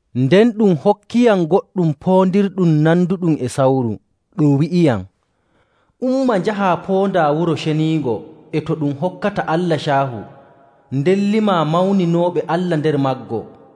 Nden ɗum hokkiyam goɗɗum poondirɗum nanduɗum e sawru, ɗum wi'iyam, “Umma njahaa poondaa wuro ceniingo e to ɗum hokkata Allah caahu, nden limaa mawninooɓe Allah nder maggo.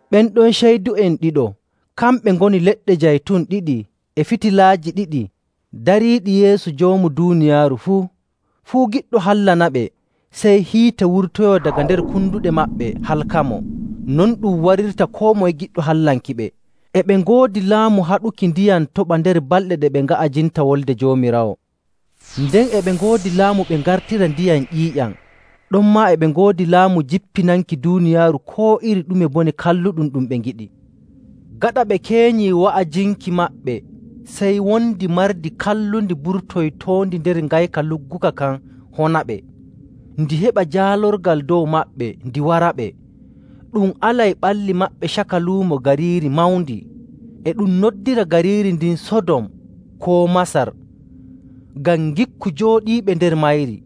Ɓen ɗon ceydu'en ɗiɗo kamɓe ngoni leɗɗe jaytun ɗiɗi e fitilaaji ɗiɗi dariiɗi yeeso Joomu duuniyaaru fuu. Fuu giɗɗo hallanaɓe, sey hiite wurtoyoo daga nder konduɗe maɓɓe halkamo. Non ɗum warirta koo moye giɗɗo hallankiɓe. E ɓe ngoodi laamu haɗuki ndiyam toɓa nder balɗe ɗe ɓe nga'ajinta Wolde Joomiraawo. Nden e ɓe ngoodi laamu ɓe ngartira ndiyam ƴiiƴam. Ɗonmaa e ɓe ngoodi laamu jippinanki duuniyaaru koo iri ɗume bone kalluɗum ɗum ɓe ngiɗi. Gaɗa ɓe keenyii wa'ajinki maɓɓe sey wondi mardi kallundi burtoytoondi nder ngayka lugguka kan honaɓe. Ndi heɓa jaalorgal dow maɓɓe ndi waraɓe. Ɗum alay ɓalli maɓɓe caka luumo gariiri mawndi. E ɗum noddira gariiri ndin “Sodom” koo “Masar” ngam ngikku jooɗiiɓe nder mayri.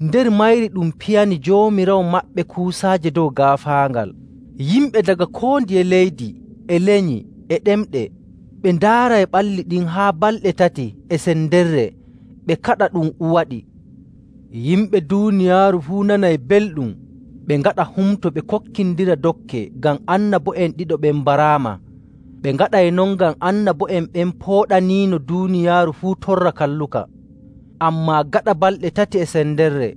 Nder mayri ɗum piyani Joomiraawo maɓɓe kuusaaje dow gaafaangal. Yimɓe daga koo ndiye leydi, e lenyi, e ɗemɗe ɓe ndaaray ɓalli ɗin haa balɗe tati e sendere ɓe kaɗa ɗum uwoyaɗi. Yimɓe duuniyaaru fuu nanay belɗum ɓe ngaɗa humto ɓe kokkindira dokke ngam annabo'en ɗiɗo ɓen mbaraama. Ɓe ngaɗay non ngam annabo'en ɓen pooɗaniino duuniyaaru fuu torra kalluka. Ammaa gaɗa balɗe tati e sendere,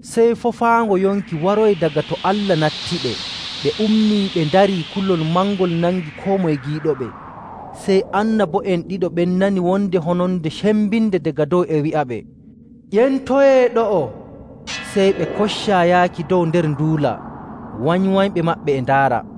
sey foofaango yonki waroyi daga to Allah nattiɓe. Ɓe ummii ɓe ndarii, kulol mangol nangi koo moye giiɗoɓe. Sey annabo'en ɗiɗo ɓen nani wonde hononde cembinde daga dow e wi'aɓe, “Ƴentoyee ɗo'o!” Sey ɓe koccaa yaaki dow nder nduula, wanywanyɓe maɓɓe e ndaara.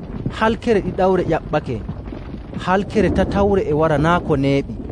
Halkere ɗiɗawre ƴaɓɓake. Halkere tatawre e wara naa' ko neeɓi.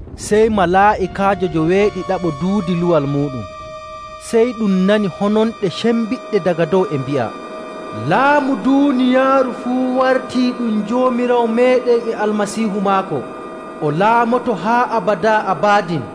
Sey malaa'ikaajo joweeɗiɗaɓo duudi luwal muuɗum, sey ɗum nani hononɗe cembiɗɗe daga dow e mbi'a, “Laamu duuniyaaru fuu wartii ɗum Joomiraawo meeɗen e Almasiihu maako. O laamoto haa abadaa abadin!”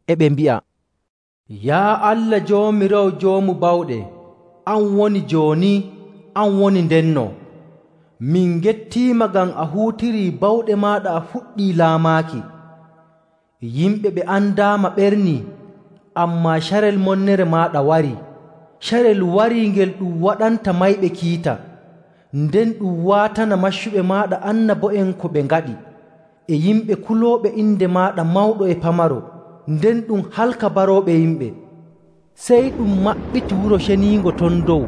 E ɓe mbi'a, “Yaa Allah Joomiraawo Joomu Bawɗe, an woni jooni, an woni ndenno! Min ngettiima ngam a huutirii bawɗe maaɗa a fuɗɗii laamaaki. Yimɓe ɓe andaama ɓernii, ammaa carel monnere maaɗa warii. Carel warii ngel ɗum waɗanta mayɓe kiita, nden ɗum waatana maccuɓe maaɗa annabo'en ko ɓe ngaɗi, e yimɓe kulooɓe inde maaɗa mawɗo e pamaro, nden ɗum halka barooɓe yimɓe.” Sey ɗum maɓɓiti wuro ceniingo ton dow,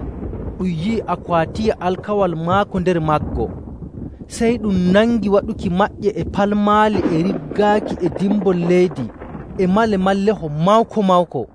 ɗum yi'i Akwaatiya Alkawal maako nder maggo. Sey ɗum nangi waɗuki maƴƴe e palmaali e riggaaki e dimbol leydi e malemalleho mawko‑mawko.